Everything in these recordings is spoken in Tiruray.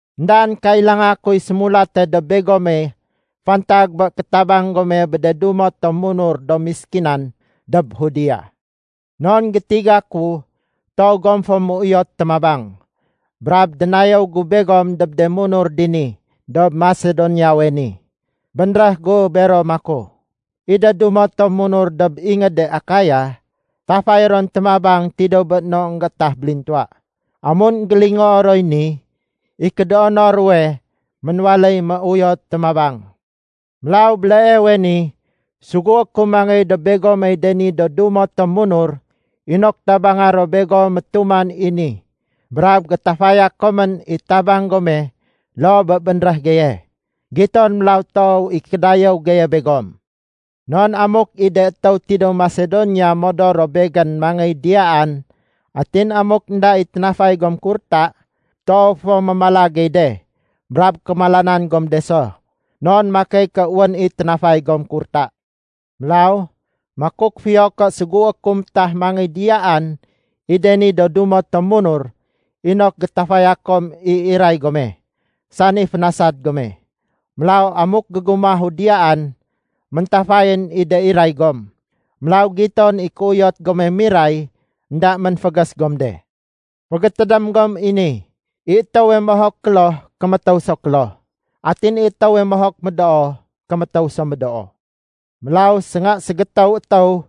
Endaén kailanga kuy sémulate dob begome fantag bé kétabang gome bé de dumo tom munur do méskinan dob Judea. Non gétiga ku toow gom fo méuyot témabang. Brab dénayéw gu begom dob de munur dini dob Masedoniawe ni. Bénréh gu bero maku, “I de dumo tom munur dob ingéde Akaya, tafay ron témabang tidéw bé no énggéétah bélintuwa.” Amun énggélingoo roy ni, i kédoono ruwe ménwaléy méuyot témabang. Mélaw béleewe ni, sugué ku mangéy dob begomey de ni do dumo tom munur inok tabanga ro begom métuman i ni brab gétafaya komén i tabang gome loo bé bénréh geye. Giton mélaw toow i kédayéw geye begom. Non amuk i de étéw tidéw Masedonia modor ro begén mangéy diyaan, atin amuk énda i ténafay gom kurta, toow fo mémala gey de, brab kémalanan gom de so. Non makey ké wén i ténafay gom kurta. Mélaw, makuk fiyo ké sugué ku métah mangéy diyaan i de ni do dumo tom munur inok gétafaya kom i iray gome, sani fénasad gome. Mélaw amuk gégumahu diyaan, méntafayén i de iray gom. Mélaw giton i kéuyot gome miray énda ménfégés gom de. Fégétédém gom i ni, i étéwe mohok kloh, kémétéw so kloh. Atin i étéwe mohok médoo, kémétéw so médoo. Mélaw, sénga ségétéw étéw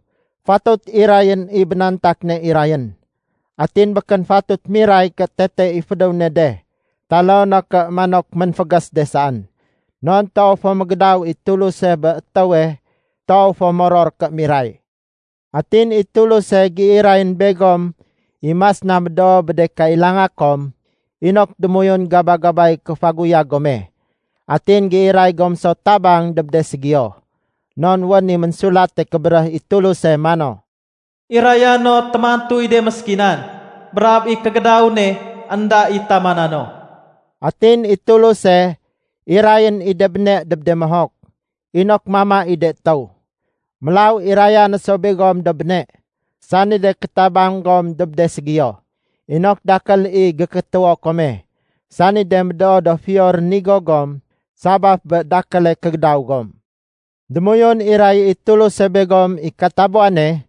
fatut irayén i bénantak ne irayén. Atin békén fatut miray ké tete i fédéw ne de taloo no ké manok ménfégés de saén. Non toow fo mégédaw i Tuluse bé étéwe toow fo moror ké miray. Atin i Tuluse géirayén begom i mas na médoo bé de kailanga kom inok démoyun gaba-gabay kéfaguyag gome atin géiray gom so tabang dob de ségiyo. Non wén i Ménsulate Kébéréh i Tuluse mano, “Iraya no témantuy de méskinan, brab i kégédaw ne énda i tamana no.” Atin i Tuluse irayén i de béne dob de mohok, inok mama i de étéw. Mélaw iraya no so begom do béne, sani de kétabang gom dob de ségiyo, inok dakél i gékétéwo kome, sani de médoo do fiyo rénigo gom sabaf bé dakéle kégédaw gom. Démoyun iray i Tuluse begom i katabuwane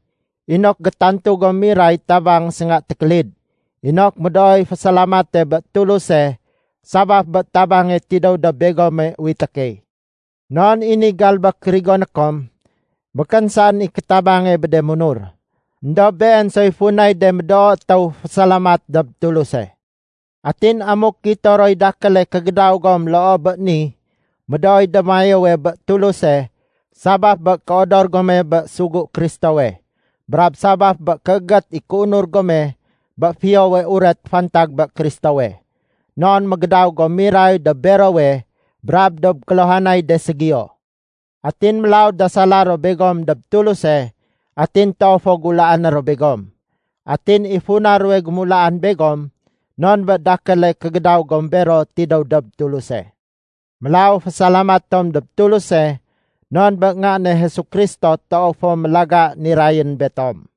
inok gétantu gom miray tabang sénga tékélid, inok médooy fésalamate bé Tuluse sabaf bé tabange tidéw dob begome uwité key. Non i ni galbék rigoné kom, békén saén i kétabange bé de munur, éndob been soy funay de médoo étéw fésalamat dob Tuluse. Atin amuk gito roy dakéle kégédaw gom loo bé ni, médooy démayéwe bé Tuluse sabaf bé kéodor gome bé sugu Kristowe, brab sabaf bé kéégét i kéunur gome bé Fiyowe Uret fantag bé Kristowe, non mégédaw gom miray dob berowe brab dob kéluhanay de ségiyo. Atin mélaw dasala ro begom dob Tuluse atin toow fo gulaané ro begom. Atin i funa ruwe gémulaan begom non bé dakéle kégédaw gom bero tidéw dob Tuluse. Mélaw fésalamat tom dob Tuluse non bé Nga ne Jesu Kristo toow fo mélaga nirayén betom.